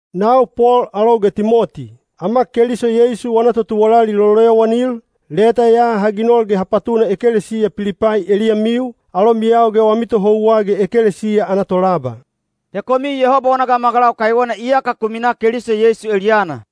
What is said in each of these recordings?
Nau Pol alou ge Timoti, ama Keliso Yeisu wana totuwalali loloyowanil, leta ya ha ginol ge ha patuna ekelesiya Pilipai eliyamiu, alomiyau ge wami tohouwa ge ekelesiya ana tolaba. He komiu Yehoba wana gamagalau kaiwena iyaka ku minaa Keliso Yeisu eliyana.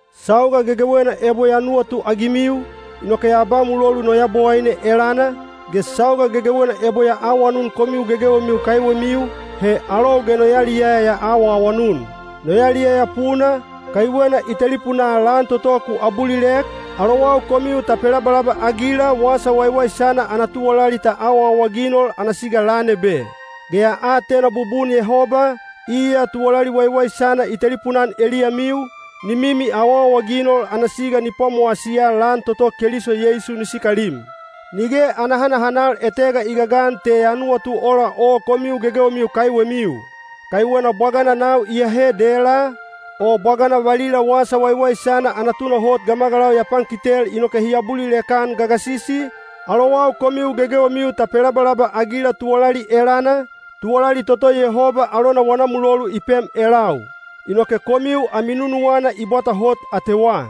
Sauga gegewena ebo ya nuwatuagimiu, inoke ya ba mulolu no Yabowaine elana, ge sauga gegewena ebo ya awanun komiu gegewemiu kaiwemiu, he alou ge no yaliyaya ya awaawanun. No yaliyaya puna, kaiwena i telipunaa lan toto ku abulilek, alowau komiu ta pelabalaba-agila wasa waiwaisana ana tuwalali ta awaawaginol ana siga lan ebe. Ge ya atena bubun Yehoba, iya tuwalali waiwaisana i telipuna-an eliyamiu, ni mimi awaawaginol ana siga ni pwamowasiya lan toto Keliso Yeisu ni sikalim. Nige ana hanahanal etega i gagan te ya nuwatu ola o komiu gegewemiu kaiwemiu. Kaiwena bwagana nau iyahe dela, o bwagana valila wasa waiwaisana ana tunahot gamagalau ya pankitel inoke hi abulilek-an gagasisi, alowau komiu gegewemiu ta pelabalaba-agila tuwalali elana, tuwalali toto Yehoba alona wana mulolu i pem elau. Inoke komiu ami nunuwana i bwata hot atewa.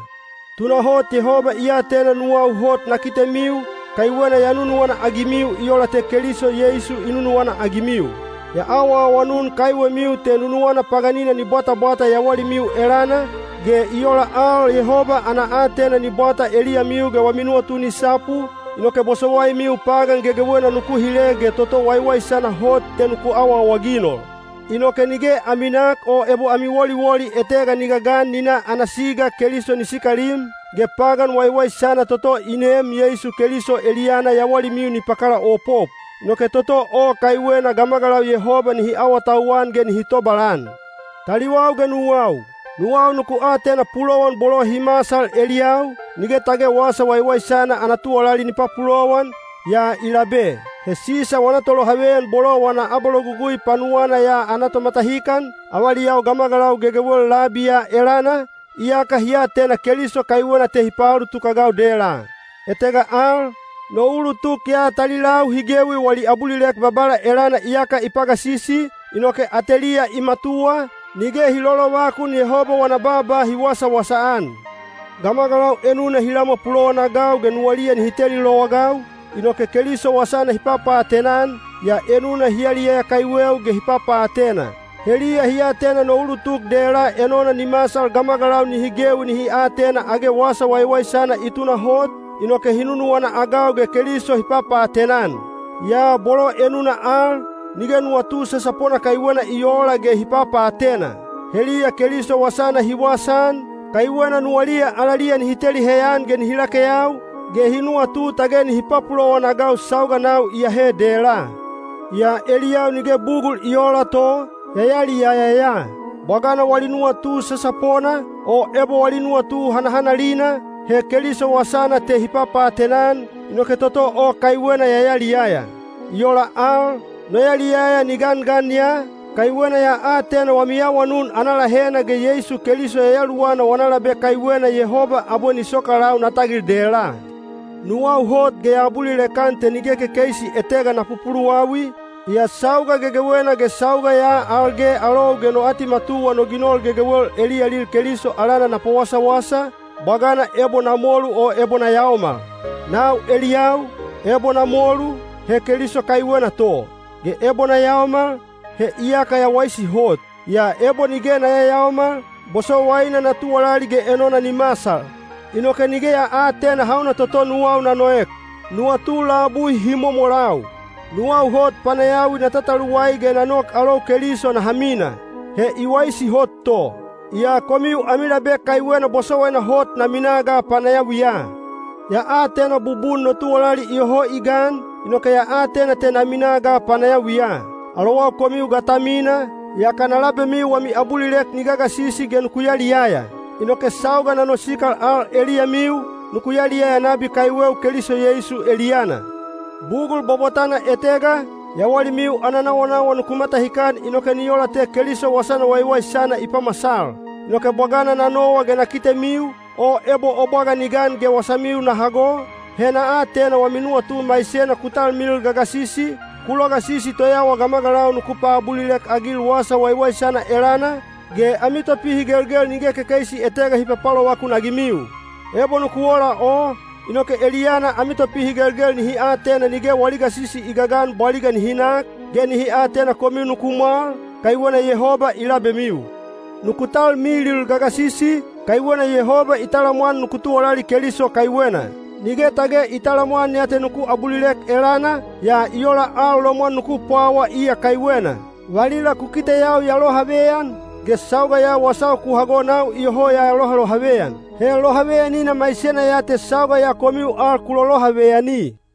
Tunahot Yehoba i atena nuwau hot na kitemiu, kaiwena ya nunuwana-agimiu i ola te Keliso Yeisu i nunuwana-agimiu. Ya awaawanun kaiwemiu te nunuwana paganina ni bwatabwata yawalimiu elana, ge i ola al Yehoba ana aatena ni bwata eliyamiu ge wami nuwatu ni sapu, inoke bosowaimiu pagan gegewena nuku hile ge toto waiwaisana hot te nuku awaawaginol. Inoke nige ami nak o ebo ami woliwoli etega ni gagan ni na ana siga Keliso ni sikalim, ge pagan waiwaisana toto i neem Yeisu Keliso eliyana yawalimiu ni pakalaopop. Inoke toto o kaiwena gamagalau Yehoba nihi awatauwan ge nihi tobalan. Taliwau ge nuwau, nuwau nuku atena pulowan bolo hi masal eliyau, nige tage wasa waiwaisana ana tuwalali ni papulowan, yaa i labe. He Sisa wana tolohaveyan bolo wana abalogugui panuwana ya ana tomatahikan, avaliyau gamagalau gegewel labi ya elana, iyaka hi atena Keliso kaiwena te hi paulutuk-agau dela. Etega al, no ulutuk ya talilau hi gewi wali abulilek Babala elana iyaka i pagasisi, inoke ateliya i matuwa, nige hi lolovakun Yehoba wana baaba hi wasawasa-an. Gamagalau enuna hi lamwa pulowanagau ge nuwaliya nihi teli lowagau, inoke Keliso wasana hi papaatena-an, yaa enuna hi yaliyaya kaiweu ge hi papaatena. Heliya hi atena no ulutuk dela enona ni masal gamagalau nihi gewi nihi atena age wasa waiwaisana i tunahot, inoke hi nunuwana-agau ge Keliso hi papaatena-an. Yaa bolo enuna al, nige nuwatu sasapona kaiwena i oola ge hi papaatena. Heliya Keliso wasana hi wasaan, kaiwena nuwaliya alaliya nihi teli heyan ge nihi lakeyau, ge hi nuwatu tage nihi papulowan-agau sauga nau iyahe dela. Yaa eliyau nige bugul i oola to, ya yaliyaya ya. Bwagana wali nuwatu sasapona, o ebo wali nuwatu hanahanalina, he Keliso wasana te hi papaatena-an, inoke toto o kaiwena ya yaliyaya. I ola al, no yaliyaya ni gangan ya, kaiwena ya atena wami awanun ana lahena ge Yeisu Keliso Yayaluwana wana labe kaiwena Yehoba abwe ni sokalau na tagil dela. Nuwau hot ge ya abulilek-an te nige kekeisi etega na pupuluwawi, yaa sauga gegewena ge sauga ya al ge alou ge no atimatuwa no ginol gegewel eliyalil Keliso alana na pawasawasa, bwagana ebo na molu o ebo na yaomal. Nau eliyau, ebo na molu, he Keliso kaiwena to. Ge ebo na yaomal, he iyaka ya waisi hot. Yaa ebo nige na yayaomal, bosowaina na tuwalali ge enona ni masal. Inoke nige ya aatena hauna toto nuwau na noek. Nuwatu labui hi momolau. Nuwau hot panayawi na tataluwai ge na nok alou Keliso naha mina. He i waisi hot to. Yaa komiu ami labe kaiwena bosowaina hot na minaa ga panayawiya. Ya atena bubun no tuwalali iyoho i gan, inoke ya atena te na minaa ga panayawiya. Alowau komiu ga ta mina, yaka na labemiu wami abulilek ni gagasisi ge nuku yaliyaya. Inoke sauga na nosikal al eliyamiu, nuku yaliyaya nabi kaiweu Keliso Yeisu eliyana. Bugul bwabwatana etega, yawalimiu ana nawanawa nuku matahikan inoke ni ola te Keliso wasana waiwaisana i pamasal. Inoke bwagana na nowa ge na kitemiu, o ebo o bwaga ni gan ge wasamiu na hago, he na atena wami nuwatu maisena ku talmilil gagasisi, ku logasisi toyawa gamagalau nuku paabulilek-agil wasa waiwaisana elana, ge ami topihigelgel nige kekeisi etega hi papalovakun-agimiu. Ebo nuku ola o, inoke eliyana ami topihigelgel nihi atena nige wali gasisi i gagan bwaliga nihi nak, ge nihi atena komiu nuku mwal, kaiwena Yehoba i labemiu. Nuku talmilil gagasisi, kaiwena Yehoba i talamwan nuku tuwalali Keliso kaiwena. Nige tage i talamwan ya te nuku abulilek elana, yaa i ola al lomwan nuku pwawa iya kaiwena. Valila ku kiteyau ya lohaveyan, ge sauga ya wasau ku hago nau iyoho ya lohalohaveyan. He lohaveyanina maisena ya te sauga ya komiu al ku lolohaveyani.